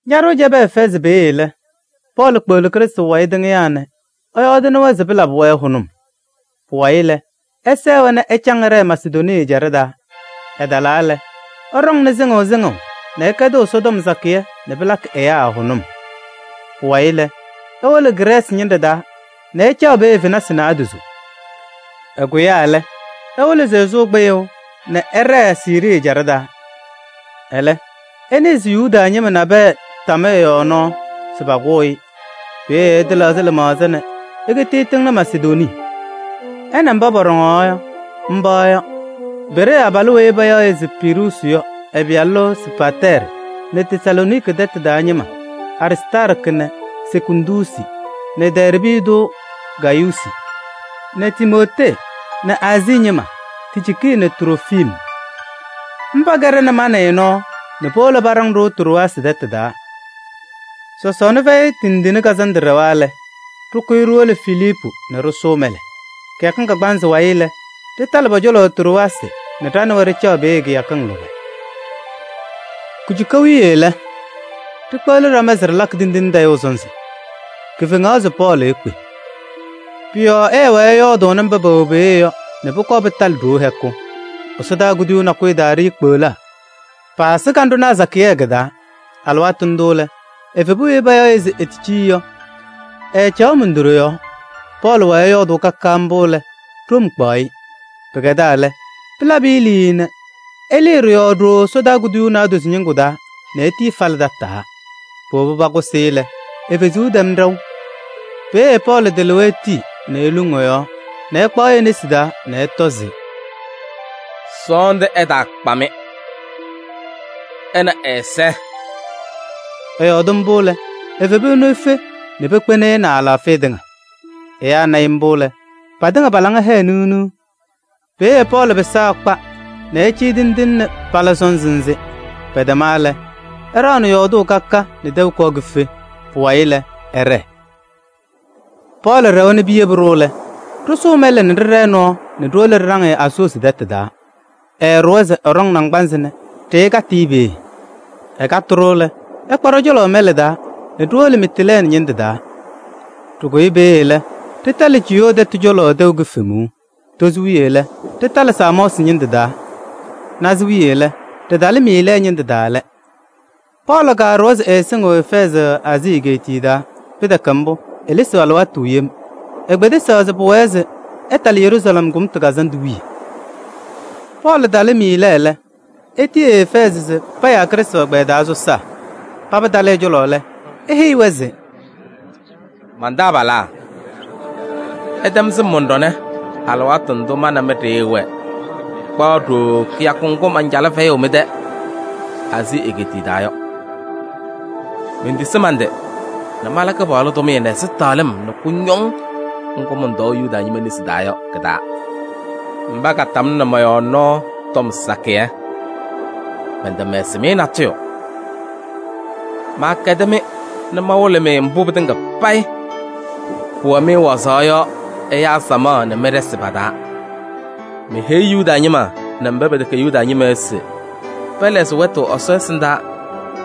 Ñaɖʋʋ cɛbɩ Efɛɛzɩ peeye lɛ, Pɔɔlɩ kpeɣli Krɩstʋ wayɩ tɩŋɩyaa nɛ ɛyɔɔdɩnɩ-wɛ se pɩlabɩ-wɛ hʋnʋm. Pʋwayɩ lɛ, ɛsɛɛ-wɛ nɛ ɛcaŋ ɛɖɛɛ Masedonii ɛjaɖɛ taa. Ɛtalaa lɛ, ɛɖɔŋnɩ sɩŋʋʋ sɩŋʋʋ nɛ ɛkɛdɩɣ Ɛsɔtɔm sakɩyɛ nɛ pɩlakɩ ɛyaa hʋnʋm. Pʋwayɩ lɛ, ewolo Grɛɛsɩ ñɩnɖɛ taa nɛ ɛcaɣ peeye fenasɩ naadozo. Ɛkʋyaa lɛ, ewolo se ɛsʋʋ kpɩyʋʋ nɛ ɛɖɛɛ Siirii ɛjaɖɛ taa. Ɛlɛ ɛnɩɩ se Yuda ñɩma nabɛyɛ tam ɛ-yɔɔ nɔɔ se pakʋʋ-ɩ. Peeye ɛtɩlɛɣzɩ lɩmaɣza nɛ ekiti ɛtɩŋnɩ Masedonii. Ɛ nɛ mba pɔɖɔŋaɣ yɔ, mba yɔ: Beree abalʋ weyi payaɣ se Piruusi yɔ ɛ-pɩyalʋ Sopatɛɛrɩ nɛ Tesalooniki tɛtʋ taa ñɩma: Aristaarkɩ nɛ Sekundusi nɛ Dɛɛrbɩ tʋ Gayuusi nɛ Timootee nɛ Aazii ñɩma: Ticiiki nɛ Trofim. Mba kɛɖɛnɩ ma nɛ ɩ nɔɔ nɛ powolo paɖaŋ-ɖʋ Trowaasɩ tɛtʋ taa. Sɔsɔɔna Fɛyɩ Tindine Kazandʋ ɖɛwa lɛ, ɖɩkʋyɩ ɖiwolo Filiipu nɛ ɖɩsʋʋ mɛlɛ. Kɩyakɩŋ kagbaanzɩ wayɩ lɛ, ɖɩtalɩ pɔ-cɔlɔ Trowaasɩ nɛ ɖa nɛ wɛ ɖɩcaɣ peeye kɩyakɩŋ lʋbɛ. Kujuka wiye lɛ, ɖikpeɣli ɖama se ɖɩlakɩ tindine tayʋʋ sɔnzɩ. Kifeŋaɣ se Pɔɔlɩ ekpe. Pʋ-yɔɔ ɛɛwɛɛ nɛ ɛyɔɔdʋʋnɩ mba pɛwɛ peeye yɔ nɛ pʋkɔɔ pɩtalɩ ɖoo hɛkʋ. Ɛsɔdaa kuduyuu nakʋyʋ taa ɖiikpeɣlaa, paasɩ kanɖʋnaa sakɩyɛ kɩ-taa. Alɩwaatʋ ndʋ lɛ, evebu weyi payaɣ se Eticii yɔ, ɛɛcaɣ mundoɖe yɔɔ. Pɔɔlɩ wɛɛ ɛyɔɔdʋʋ ka ka mbʋ lɛ, ɖom kpaɣ-ɩ. Pɩkɛdaa lɛ, pɩlabɩ-ɩ liii nɛ ɛlɩnɩ ɖɩ-yɔɔ ɖooo ɛsɔdaa kuduyuu naadozo ñɩŋgʋ taa nɛ etii ɛfalɩ tataa. Powobi pakʋsɩ-ɩ lɛ, e-fezuu tɛm ɖɛʋ. Peeye Pɔɔlɩ tɩlɩwa etii nɛ eluŋ ɛ-yɔɔ nɛ ɛkpaɣ-ɩ e-nesi taa nɛ ɛtɔ se: “Sɔɔndʋ ɛtaakpa-mɩ: ɛ nɛ ɛ-ɛza!” Ɛyɔɔdɩ mbʋ lɛ, evebu ɛnʋ efe nɛ pekpeni-i nɛ ɛ-alaafɩya tɩŋa. Ɛyaa na-ɩ mbʋ lɛ, patɩŋa pa-laŋa hɛɛ niɣ niɣ. Peeye Pɔɔlɩ pɩsaa ɛkpa nɛ ɛcɩyɩ tindine nɛ pala sɔnzɩ nzɩ. Pɛtɛma lɛ, ɛɖaɣnɩ yɔɔdʋʋ ka ka nɛ tɛʋ kɔɔ kife. Pʋwayɩ lɛ, ɛɖɛɛ. Pɔɔlɩ ɖɛwa nɛ piyebi-ɖʋ lɛ, ɖɩsʋʋ mɛlɛ nɛ ɖɩɖɛɛ nɔɔ nɛ ɖiwolo ɖɩɖaŋ-ɩ Asoosi tɛtʋ taa. Ɛɛɖʋwa se ɛɖɔŋ naŋgbanzɩ nɛ ɖɩkatɩ-ɩ peeye. Ɛkatɩ-ɖʋ lɛ, ɛkpa ɖɔ-cɔlɔ mɛlɛ taa nɛ ɖiwolo Mitiilɛɛnɩ ñɩndʋ taa. Ɖɩkʋyɩ peeye lɛ, ɖɩtalɩ Ciyoo tɛtʋ cɔlɔ tɛʋ kifemuu. Tozo wiye lɛ, ɖɩtalɩ Samɔɔsɩ ñɩndʋ taa. Naza wiye lɛ, ɖɩtalɩ Miilɛɛ ñɩndʋ taa lɛ. Pɔɔlɩ kaɖʋwa se ɛɛsɩŋɩɣ Efɛɛzɩ Aazii egeetiye taa, pɩtɛkɛ mbʋ, elesiɣ alɩwaatʋ yem. Ekpedesaɣ se pʋwɛɛ yɔ, ɛtalɩ Yeruusalɛm Kʋmtʋ Kazandʋ wiye. Pɔɔlɩ talɩ Miilɛɛ lɛ, etiyi Efɛɛzɩ se payaa Krɩstʋ ɛgbɛyɛ taa sɔsaa. Paba talɩ ɛ-cɔlɔ lɛ, eheyi-wɛ se: “Man-taabalaa! Ɩtɛm sɩm mɔn-ɖɔnɛ alɩwaatʋ ndʋ ma nɛ mɩ ɖɩɩwɛɛ kpaɣ ɖooo kɩyakʋ ŋgʋ mancalɩ fɛyʋʋ mɩ-tɛ Aazii egeetiye taa yɔ. Mentisi man-tɩ nɛ mala Kɩpaɣlʋ tʋmɩyɛ nɛ ɛzɩtɛɣlɩm nɛ kʋñɔŋ ŋgʋ mɔntɔɔ Yuda ñɩma nesi taa yɔ kɩ-taa. Mba katamnɩ mɔ-yɔɔ nɔɔ tɔm sakɩyɛ. Mɛntɛmɛsɩ-mɩ natʋyʋ. Maakɛdɩ-mɩ nɛ mawɩlɩ-mɩ mbʋ pɩtɩŋa payɩ pʋwɛ-mɩ wazaɣ yɔ samaɣ nɛ mɩ-ɖɩsɩ pa-taa. Meheyi Yuda ñɩma nɛ mba pɛtɛkɛ Yuda ñɩma yɔ se pɛlɛɣzɩ wɛtʋ Ɛsɔ ɛsɩndaa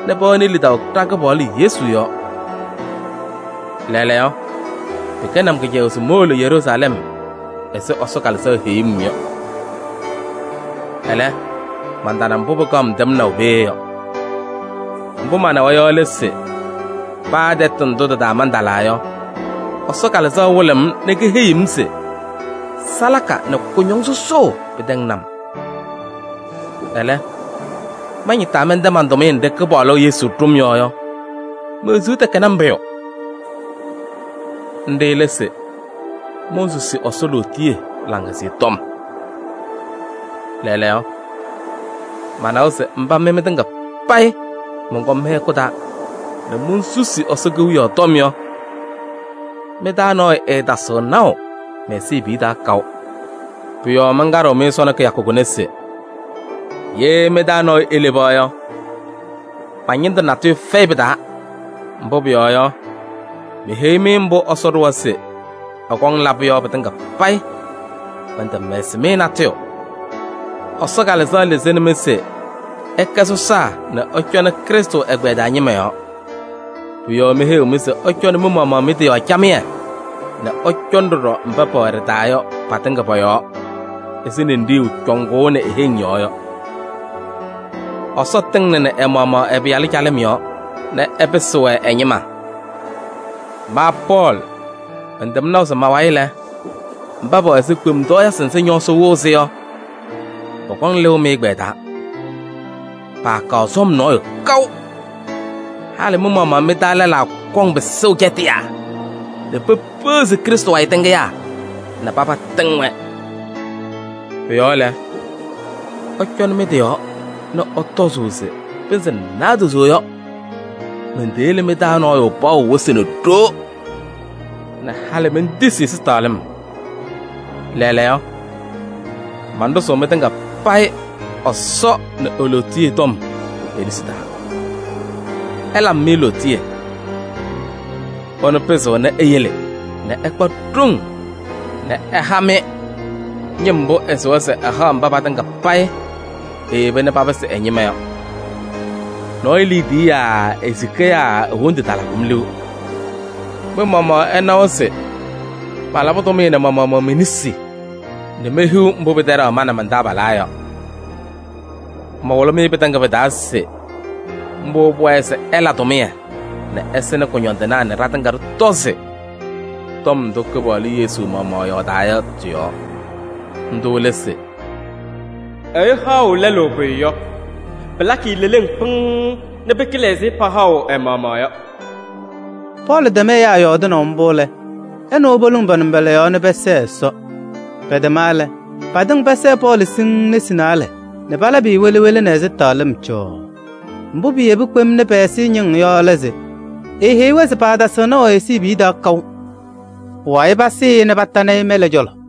nɛ pɛwɛnɩ lidaʋ ɖa-Kɩpaɣlʋ Yesu yɔɔ. Lɛɛlɛɛyɔ, pɩkɛnɩ-m kɩcɛyʋʋ se mowolo Yeruusalɛm ɛzɩ Ɛsɔ Kalɩzaɣ heyuu-m yɔ. Ɛlɛ, mantana mbʋ pɩkaɣ-m tɛmnaʋ peeye yɔ. Ndʋ manawa yɔ lɛ se: paa tɛtʋ ndʋ tɩ-taa mantalaa yɔ, Ɛsɔ Kalɩzaɣ wɩlɩɣ-m nɛ keheyiɣ-m se salaka nɛ kʋñɔŋ sɔsɔʋ pɩtɛŋnɩ-m. Ɛlɛ, mañɩtaa mɛntɛ man-tʋmɩyɛ nɖɩ Kɩpaɣlʋ Yesu ɖʋ-m yɔ yɔ, me-wezuu tɛkɛnɩ-m pʋyʋ. Nɖɩ lɛ se: monsusi Ɛsɔ lootiye Laŋhɛzɩyɛ Tɔm. Lɛɛlɛɛyɔ, manawa se mba mɩ mɩtɩŋa payɩ mɔnkɔm mɩ-hɛkʋ taa nɛ monsusi Ɛsɔ Kewiyaɣ tɔm yɔ, mɩ-taa nɔɔyʋ ɛɛtasɩɣ naʋ mɛ-ɛzɩbiye taa kaʋ. Pʋ-yɔɔ mankaɖɩɣ-mɩ sɔnɔ kɩyakʋ kʋnɛ se: ye mɩ-taa nɔɔyʋ eleba yɔ, ma-ñɩndʋ natʋyʋ fɛyɩ pɩ-taa. Mbʋ pʋyɔɔ yɔ, meheyi-mɩ mbʋ Ɛsɔ ɖʋwa se ɛkɔŋ labʋ yɔ pɩtɩŋa payɩ, mɛntɛmɛsɩ-mɩ natʋyʋ. Ɛsɔ Kalɩzaɣ lɩzɩnɩ-mɩ se ɩkɛ sɔsaa nɛ ɩcɔnɩ Krɩstʋ ɛgbɛyɛ taa ñɩma yɔɔ. Pʋ-yɔɔ meheyiɣ-mɩ se ɩcɔnɩ mɩ-maɣmaɣ mɩ-tɩ yɔɔ camɩyɛ nɛ ɩcɔnɩ ɖɔɖɔ mba pɛwɛ ɖɩ-taa yɔ patɩŋa pɔ-yɔɔ ɛzɩ ninɖiɣyu cɔŋʋʋnɩ e-heŋ yɔɔ yɔ. Ɛsɔ tɩŋnɩnɩ ɛ-maɣmaɣ ɛ-Pɩyalʋ calɩm yɔɔ nɛ ɛpɩsɩ-wɛ ɛ-ñɩma. Ma Pɔɔlɩ mɛntɛm naʋ se ma-wayɩ lɛ, mba pɛwɛ ɛzɩ kpemtɔɔyɩsɩ nzɩ ñɔɔsɩ wɩɣ-sɩ yɔ, pɔkɔŋ lɩʋ mɩ-ɛgbɛyɛ taa, paakaɣ sɔm nɔɔyʋ kaʋ. Halɩ mɩ-maɣmaɣ mɩ-taa lɛlaa kɔŋ pɩsʋʋ cɛtɩyaa nɛ pepeɣzi Krɩstʋ wayɩ tɩŋɩyaa nɛ paba tɩŋ-wɛ. Pʋ-yɔɔ lɛ, ɩcɔnɩ mɩ-tɩ yɔɔ nɛ ɩtɔzʋʋ se pɩnzɩ naadozo yɔ, menteyele mɩ-taa nɔɔyʋ paɣʋ wɩsɩ nɛ ɖoo nɛ halɩ mentisi ɛzɩtɛɣlɩm. Lɛɛlɛɛyɔ, manɖʋzʋʋ mɩtɩŋa payɩ Ɛsɔ nɛ e-lootiye tɔm pe-nesi taa. Ɛlabɩ-mɩ lootiye. Ɛnʋ pɩzɩɣnɩ eyele nɛ ɩkpa ɖoŋ nɛ ɛha-mɩ ñɩm mbʋ ɛsɩwa se ɛhaɣ mba patɩŋa payɩ eyeba nɛ papɩsɩ ɛ-ñɩma yɔ. Nɔɔyʋ liidiye yaa e-sika yaa e-wondu talabɩ-m liu. Mɩ-maɣmaɣ ɩnawa se malabɩ tʋmɩyɛ nɛ ma-maɣmaɣ me-nesi nɛ mehiɣ mbʋ pɩtɛɖaɣ ma nɛ man-taabalaa yɔ. Mawɩlɩ-mɩ pɩtɩŋa pɩ-taa se mbʋ pʋwɛɛ se ɩla tʋmɩyɛ nɛ ɩsɩnɩ kʋñɔndɩnaa nɛ ɖatɩŋa ɖɩtɔzɩ tɔm ndʋ Kɩpaɣlʋ Yesu maɣmaɣ yɔɔdaa yɔ tɩ-yɔɔ. Ndʋ lɛ se: ‘Ɛyʋ haɣʋ lɛlʋ pʋyʋ yɔ, pɩlakɩ-ɩ leleŋ pɩŋŋ nɛ pɩkɩlɩ ɛzɩ pahaɣʋ ɛ-maɣmaɣ yɔ.’” Pɔɔlɩ tɛm ɛyaa yɔɔdɩnaʋ mbʋ lɛ, ɛ nɛ wɛ poluŋ pa-nʋmbɔla yɔɔ nɛ pɛsɛɛ Ɛsɔ. Pɛtɛma lɛ, patɩŋa pɛsɛɛ Pɔɔlɩ siŋŋ nesi naalɛ nɛ palabɩ-ɩ wele wele nɛ ɛzɩtɛɣlɩm cɔɔɔ. Mbʋ piyebi kpem nɛ pɛ-ɛza ñɩŋ yɔ lɛ se: eheyi-wɛ se paatasɩɣ naʋ ɛ-ɛzɩbiye taa kaʋ. Pʋwayɩ pasɩ-ɩ nɛ patanɩ-ɩ mɛlɛ cɔlɔ.